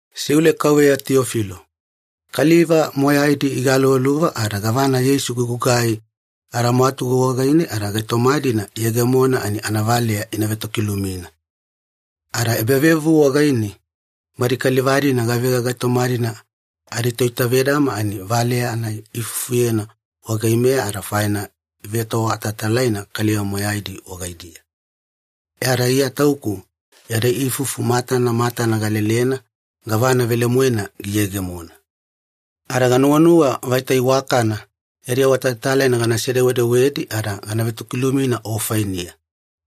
Siule kauveya Tiyofilo. Kaliva moyaidi igaluvaluva ada gavana Yeisu gigugai adamwatugu wagaine ada gaitoma-dina iyegemona ani anavaleya ina vetokilumina. Ada ebavevuvu wagaine badi kaliva-dina gavega gaitoma-dina aditoitavedama ani valeya-nai iifufuyena wagaimeya ada faine ivetoawatalatalaina kaliva moyaidi wagaidiya. E ada Iya tauku yadi ifufu matana matana galelena gavana velemoena giyegemona. Ada ganuwanuwa vaita iwakana yadi awatalatalaina ganase-dewedewedi ada gana vetokilumina o fainiya,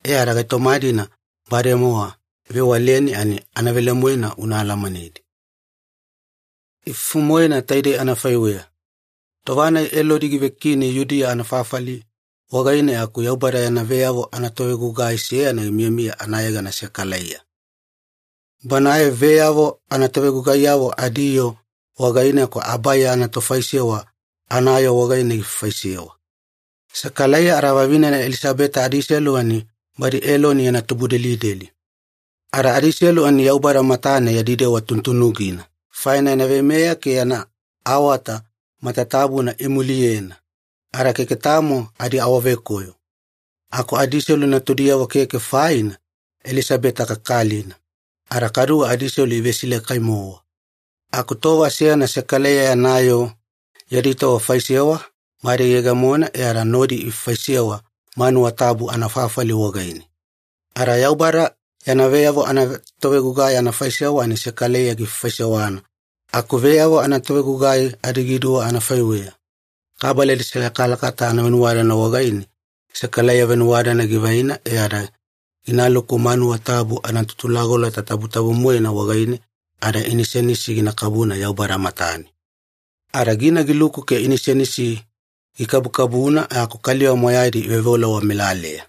e ada gaitoma-dina bademowa ivewaleni ani anavelemoena una alamanedi. Ifufu-moena taidei anafaiweya. Tova-nai Elodi givekini Yudiya anafafali wagaine aku Yaubada yana veyavo anatovegugai seyana gimiyamiya anayegana Sekalaiya. Banae veyavo anatovegugaiyavo adiyoo wagaine aku Abaiya anatofaisewa anayoo wagaine gifaifaisewa. Sekalaiya ada vavinena Elisabeta adiselu ani badi Eloni yana tubudelideli. Ada adiselu ani Yaubada matane yadi dewa tunutunugina, faina yana veimeya ke yana awata matatabuna imuliyena, ada keke tamo adiawavekoyo. Aku adiselu natudiyavo keke, faina Elisabeta kakalina, ada kaduwe adiselu ivesilakai-mowa. Aku tova seyana Sekalaiya yana yoo yadi tova faisewa bade giyegemona e ada nodi ifaifaisewa manuwa tabu anafafali wagaine. Ada Yaubada yana veyavo anatovegugai anafaisewa ani Sekalaiya gifaifaisewana aku veyavo anatovegugai adigiduwa anafaiweya, kabala adiselakalakata anavenuwadadana wagaine Sekalaiya venuwadadana givaina e ada ginaluku manuwa tabu anaTutulagolota Tabutabu-moena wagaine, ada inisenisi gina kabuna Yaubada matane. Ada gina giluku ke inisenisi gikabukabuna aku kaliva moyaidi iveoveola wamelaleya,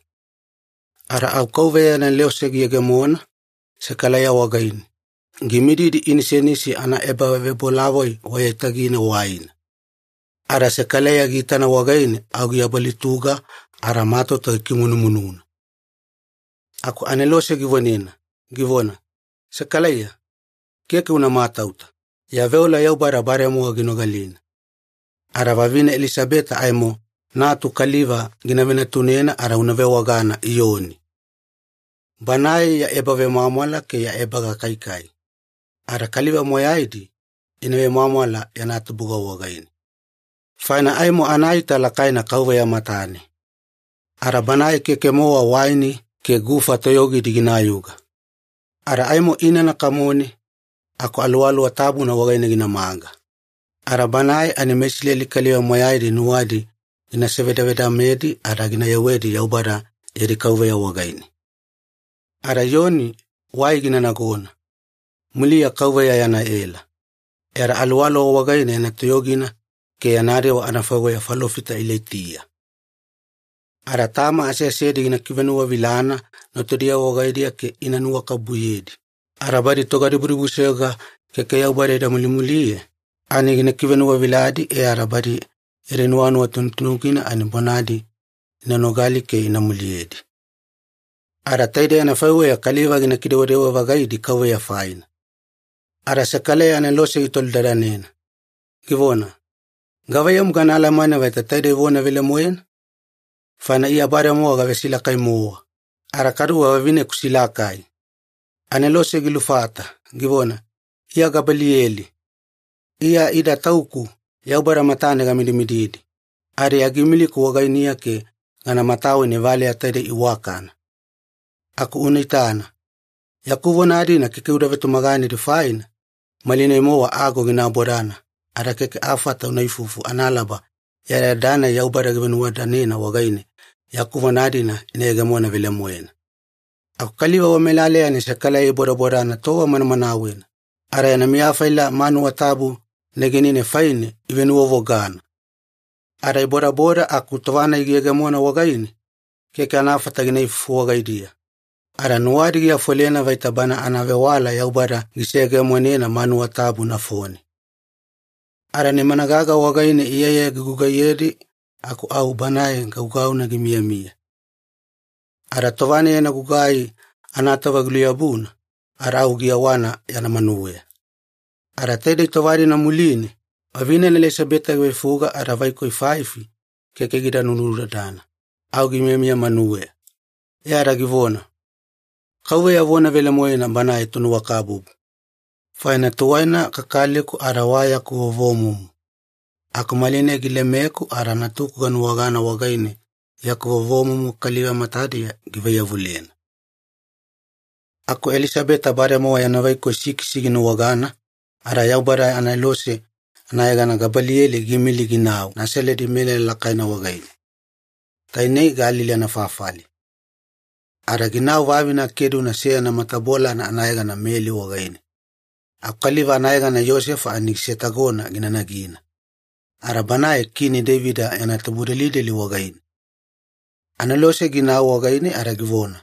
ada au KAUVEYA yana anelose giyegemo Sekalaiya wagaine, gimididi inisenisi anaebavebolavoi wa aiyatagine waina. Ada Sekalaiya giitana wagaine au giabalutuga ada matauta gikimunumununa. Aku anelose givonena, givona, “Sekalaiya, keke una matauta, ya veola Yaubada bademowa ginogalina. Ada vavine Elisabeta aimo natu kaliva gina venatunena ada una vewagana Iyoni. Banae ya ebavemwamwala ke ya ebagakaikai, ada kaliva moyaidi ina vemwamwala yana tubuga wagaine. Faina aimo anaita lakaina Kauveya matane. Ada banae keke-mowa waini ke gufa toyogidi ginayuga. Ada aimo inana kamone aku Aluwaluwa Tabuna wagaine ginamaga. Ada banae ani meIsileli kaliva moyaidi nuwadi gina sevedavedamedi ada gina yewedi Yaubada yadi Kauveya wagaine. Ada Iyoni wai gina nagona, muliya Kauveya yana ela, ada aluwaluwana wagaine yana toyogina ke yana dewa anafaiweya falofita Ilaitiya. Ada tama aseasedi gina kivenuwavilana natudiyavo wagaidiya ke ina nuwakabubuyedi, ada badi togadibudibusoyoga keke Yaubada ida mulimuliye ani gina kivenuwaviladi e ada badi yadi nuwanuwa tunutunugina ani bonadi ina nogali ke ina muliyedi. Ada taidei anafaiweya kaliva gina kidewadewa-vagaidi Kauveya faina.” Ada Sekalaiya anelose gitolidadanena, givona, “Gavaiyamu gana alamane vaita taidei vona velemoena? Faina Iya bademowa gavesilakai-mowa, ada kaduwe vavineku silakai.” Anelose gilufata, givona, “Iya Gabaliyeli. Iya ida tauku Yaubada matane gamidimididi, ada Iya giimiliku wagainiya ke gana mataweni valeya taidei iwakana. Aku una itana. Yaku vona-dina keke uda vetumaganedi faina, malinai-mowa ago gina abodana ada keke afata una ifufu analaba yadayada-nai Yaubada givenuwadadanena wagaine yaku vona-dina ina yegemona velemoena.” Aku kaliva wamelaleya ani Sekalaiya ibodabodana tova manamanawena, ada yana miya faila manuwa tabu negenine faine ivenuwavogana. Ada ibodaboda aku tova-nai giyegemona wagaine, keke anafata gina ifufu wagaidiya, ada nuwadi giafolena vaita bana anavewala Yaubada giseyegemonena manuwa tabu nafone. Ada nimana gaga wagaine iyaiyaya gigugaiyedi aku au banae gaugauna gimiyamiya. Ada tova-nai yana gugai anatova giluyabuna, ada au giyewana yana manuweya. Ada taidei tova-dina muline, vavinena Elisabeta giveifuga ada vaikoi faifi keke gida nunudadana, au gimiyamiya manuweya, e ada givona, “Kauveya vona velemoena Banae Tonuwakabubu! Faina tuwaina kakaliku ada wa yaku vovomumu, aku malinai gilemeku ada natuku ganuwagana wagaine yaku vovomumu kaliva matadiya givaiyavulena.” Aku Elisabeta bademowa yana vaikoi sikisi ginuwagana ada Yaubada anelose anayegana Gabaliyeli giimili ginau Nasaledi melala lakaina wagaine, tainei Galili anafafali. Ada ginau vavine akeduna seyana matabolana anayegana Meli wagaine, aku kaliva anayegana Iyosefa ani gisetagona gina nagina, ada banae Kini Deivida yana tubudelideli wagaine. Anelose ginau wagaine ada givona,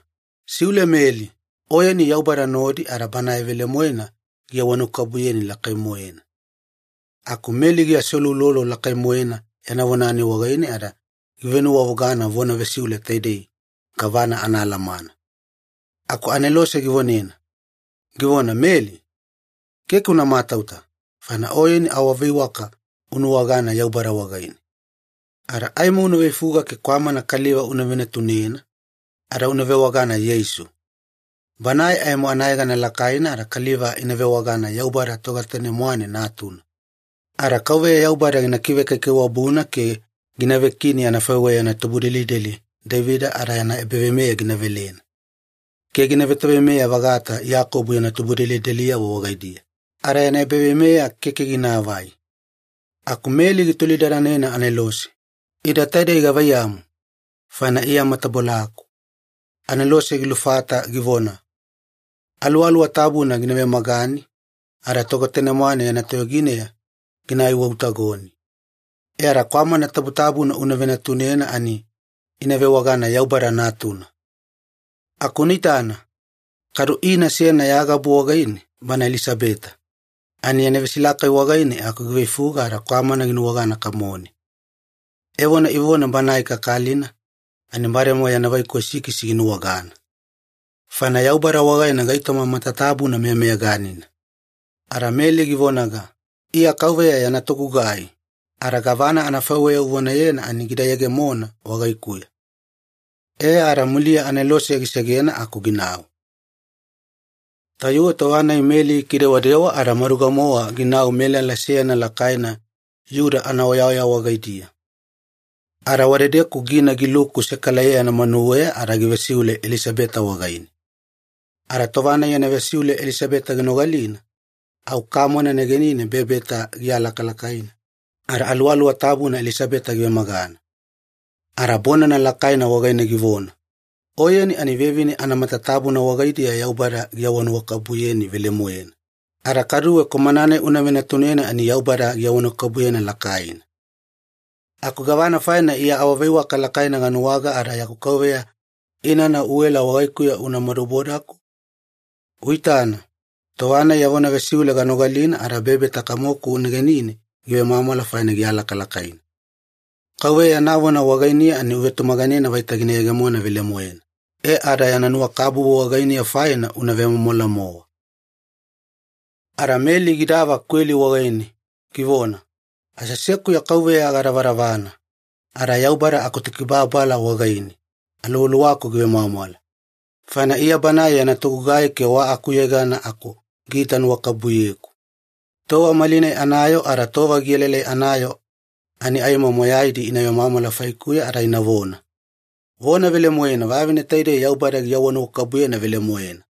“Siule Meli, oyeni Yaubada nodi ada Banae velemoena giawanuwakabubuyeni lakai-moena.” Aku Meli giaseuloulolo lakai-moena yana vona-nai wagaine ada givenuwavogana vona vesiule taidei gavana anaalamana. Aku anelose givonena, givona, “Meli, keke una matauta, faina oyeni awaveiwaka unuwagana Yaubada wagaine. Ada aimo una veifuga ke kwamana kaliva una venatunena, ada una vewagana Yeisu. Banae aimo anayegana lakaina ada kaliva ina vewagana Yaubada Togetane-mwane Natuna. Ada Kauveya Yaubada gina kivekaikaiwabuna ke gina vekini anafaiweya yana tubudelideli Deivida ada yana ebaveimeya gina velena ke gina vetoveimeya-vagata Iyakobo yana tubudelideliyavo wagaidiya, ada yana ebaveimeya keke ginaavai.” Aku Meli gitolidadanena anelose, “Ida taidei gavaiyamu? Faina Iya matabolaku.” Anelose gilufata givona, “Aluwaluwa Tabuna gina vemagani, ada Togetane-mwane yana toyogineya gina aiwautagoni. E ada kwamana tabutabuna una venatunena ani ina vewagana Yaubada Natuna. Aku una itana, kadu ina seyana ya gabu wagaine, bana Elisabeta, ani yana vesilakai wagaine aku giveifuga ada kwamana ginuwagana kamone. Evona ivona banae kakalina ani bademowa yana vaikoi sikisi ginuwagana. Faina Yaubada wagaine gaitoma matatabuna meyameyaganina.” Ada Meli givonaga, “Iya Kauveya yana togugai, ada gavana anafaiweya uvonayena ani gida yegemona wagaikuya.” E ada muliya anelose gisegena aku ginau. Tayuwe tova-nai Meli gikidewadewa ada maduga-mowa ginau melala seyana lakaina Iyuda anaoyaoya wagaidiya, ada wadedeku gina giluku Sekalaiya yana manuweya ada givesiule Elisabeta wagaine. Ada tova-nai yana vesiule Elisabeta ginogalina, au kamona negenine bebeta gialakalakaina, ada Aluwaluwa Tabuna Elisabeta givemagana. Ada bonana lakaina wagaine givona, “Oyeni ani vevine anamatatabuna wagaidiya Yaubada giawanuwakabubuyeni velemoena, ada kaduwe kwamana-nai una venatunena ani Yaubada giawanuwakabubuyena lakaina. Aku gavana faina Iya awaveiwaka lakaina ganuwaga ada yaku Kauveya inana uela wagaikuya una madubodaku? Uitana, tova-nai ya vona vesiule ganogalina ada bebeta kamoku negenine givemwamwala faina gialakalakaina. Kauveya yana vona wagainiya ani uvetumaganena vaita gina yegemona velemoena, e ada yana nuwakabubu wagainiya faina una vemwamwala-mowa!” Ada Meli gidava kweli wagaine, givona, “Aseasekuya Kauveya gadavadavana, ada Yaubada akuTokibababala wagaine aluwaluwaku givemwamwala, faina Iya Banae yana togugai keke wa akuyegana aku giita nuwakabubuyeku. Tova malinai anayoo ada tova gielaelai anayoo ani aimo moyaidi ina vemwamwala faikuya ada inavona, ‘Vona velemoena vavine taidei Yaubada giawanuwakabubuyena velemoena.’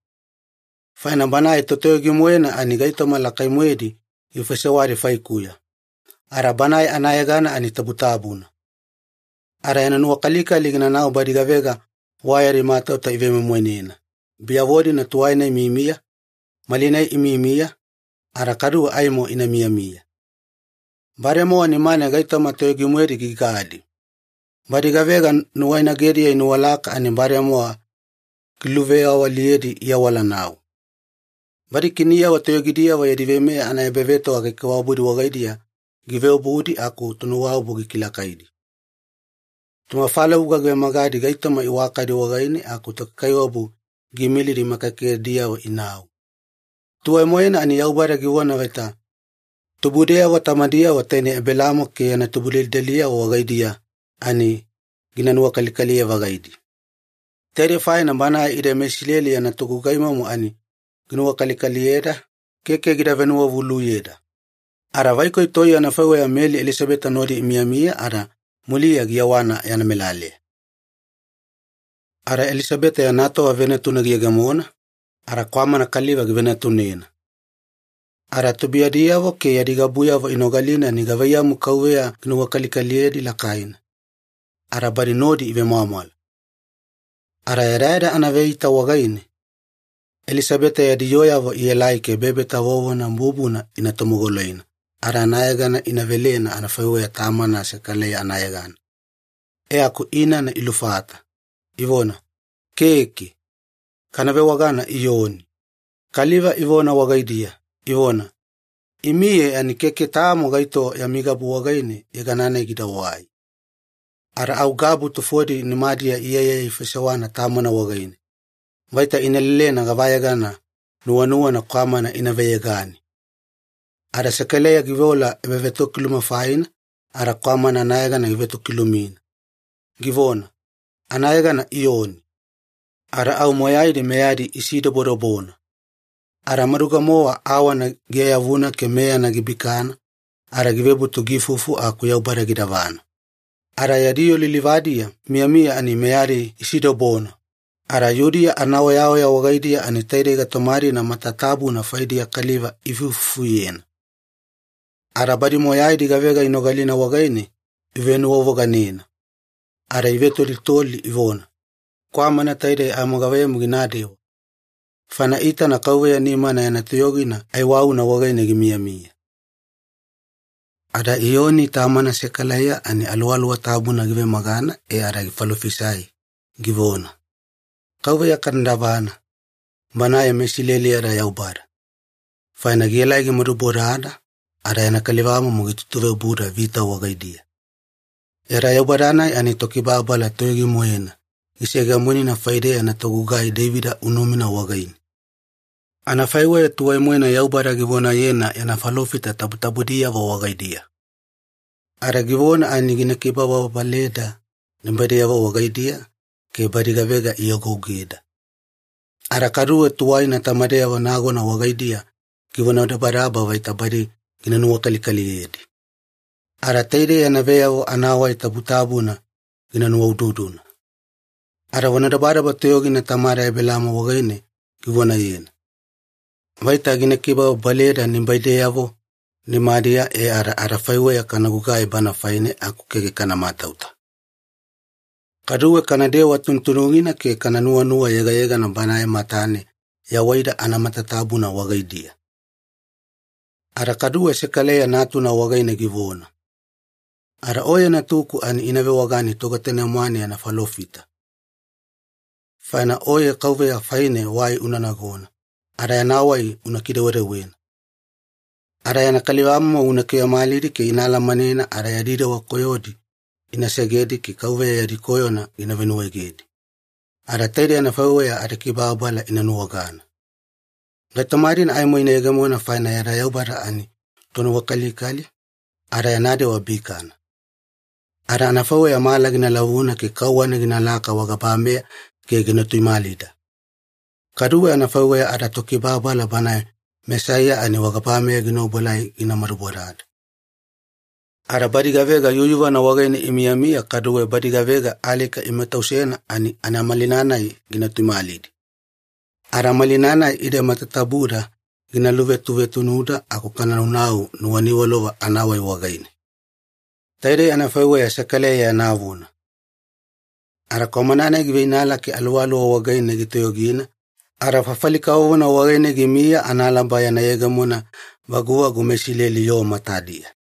Faina Banae Totoyogi-moena ani gaitoma lakai-moedi gifaisewadi faikuya, ada Banae anayegana ani tabutabuna. Ada yana nuwakalikali ginaunau badi gavega wa yadi matauta ivemoimoinena, biyavo-dina tuwaina imiyamiya, malinai imiyamiya, ada kaduwe aimo ina miyamiya. Bademowa nimane gaitoma toyogi-moedi gigadi. Badi gavega nuwainagediya inuwalaka ani bademowa giluveyawaliyedi iawalanau. Badi kiniyavo toyogidiyavo yadi veimeya anaebavetoga kaikaiwabudi wagaidiya giveobudi aku tonuwaobu gikilakaidi. Tomafalavuga givemagadi gaitoma iwakadi wagaine aku tokaikaiwabu giimilidi makagekagediyavo inau. Tuwai-moena ani Yaubada givona vaita tubudeyavo tamadiyavo tainei Ebelaamo ke yana tubudelideliyavo wagaidiya ani gina nuwakalikaliye-vagaidi. Taidei faina Banae ide meIsileli yana togugaimomo ani ginuwakalikaliyeda, keke gida venuwavuluyeda.” Ada vaikoi toiye anafaiweya Meli Elisabeta nodi imiyamiya ada muliya giyewana yana melaleya. Ada Elisabeta yana tova venatuna giyegemona, ada kwamana kaliva givenatunena. Ada tubuiyadiyavo ke yadi gabuyavo inogalina ani gavaiyamu Kauveya ginuwakalikaliyedi lakaina, ada badi nodi ivemwamwala. Ada yadayada anaveeita wagaine, Elisabeta yadi yooyavo ielai ke bebeta vovona bubuna ina tomogoloina ada anayegana ina velena anafaiweya tamana Sekalaiya anayegana, e aku inana ilufata, ivona, “Keke. Kana vewagana Iyoni.” Kaliva ivona wagaidiya, ivona, “Imiye ani keke tamo gaito yami gabu wagaine yegana-nai gidawai.” Ada au gabu tufodi nimadiya iyaiyaya ifaisewana tamana wagaine, vaita ina lelena gavayegana nuwanuwana kwamana ina veyegane. Ada Sekalaiya giveola ebavetokiluma faina ada kwamana anayegana givetokilumina, givona, “Anayegana Iyoni.” Ada au moyaidi meyadi isidobodobona. Ada maduga-mowa awana giayavuna ke meyana gibikana ada givebutu giifufu aku Yaubada gidavana. Ada yadi yoo lilivadiya imiyamiya ani meyadi isidobona, ada Yudiya anaoyaoya wagaidiya ani taidei gaitoma-dina matatabuna faidiya kaliva iifuifufuyena. Ada badi moyaidi gavega inogalina wagaine ivenuwavoganena, ada ivetolitoli ivona, “Kwamana taidei aimo gavaiyamu ginadewa?” Faina iitana Kauveya nimana yana toyogina aiwauna wagaine gimiyamiya. Ada Iyoni tamana Sekalaiya ani Aluwaluwa Tabuna givemagana e ada gifalofisai, givona, “Kauveya kana davana, Banae meIsileli yada Yaubada, faina gielai gimadubodada ada yana kalivamomo gitutuveobuda vita wagaidiya. Yada Yaubada-nai ani Tokibababala toyogi-moena giseyegemonena faideya yana togugai Deivida unumina wagaine, anafaiweya tuwai-moena Yaubada givonayena yana falofita tabutabudiyavo wagaidiya. Ada givona ani gina kibababaleda nibaideyavo wagaidiya ke badi gavega iagougeda. Ada kaduwe tuwaina tamadeyavo nagona wagaidiya givonadabadaba vaita badi gina nuwakalikaliyedi. Ada taidei yana veyavo anawai tabutabuna gina nuwaududuna. Ada vonadabadaba toyogina tamada Ebelaamo wagaine givonayena, vaita gina kibababaleda nibaideyavo nimadiya e ada adafaiweya kana gugai Banae faine aku keke kana matauta. Kaduwe kanadewa tunutunugina ke kana nuwanuwa yegayegana Banae matane yawaida anamatatabuna wagaidiya.” Ada kaduwe Sekalaiya natuna wagaine givona, “Ada oye natuku ani ina vewagani Togetane-mwane yana falofita, faina oye Kauveya faine wai una nagona ada yana wai una kidewedewena. Ada yana kalivamomo una kivemalidi ke ina alamanena ada yadi dewa koyodi ina segedi ke Kauveya yadi koyona gina venuwaegedi, ada taidei anafaiweya adikibababala ina nuwagana. Gaitoma-dina aimo ina yegemona faina yada Yaubada ani Tonuwakalikali, ada yana dewa bikana. Ada anafaiweya mala gina lavuna ke kauwana ginalaka wagabameya ke gina tuimalida, kaduwe anafaiweya adaTokibababala Banae Mesaiya ani wagabameya gina obuelai gina madubodada. Ada badi gavega yuyuvana wagaine imiyamiya kaduwe badi gavega alika imatausena ani anamalina-nai gina tuimalidi, ada malina-nai ide matatabuda gina luvetuvetunuda aku kana naunau nuwaniwalova anawai wagaine.” Taidei anafaiweya Sekalaiya yana vona. Ada kwamana-nai giveinala ke aluwaluwana wagaine gitoyogina, ada fafali kavovona wagaine gimiya analaba yana yegemona vaguvagu meIsileli yoo matadiya.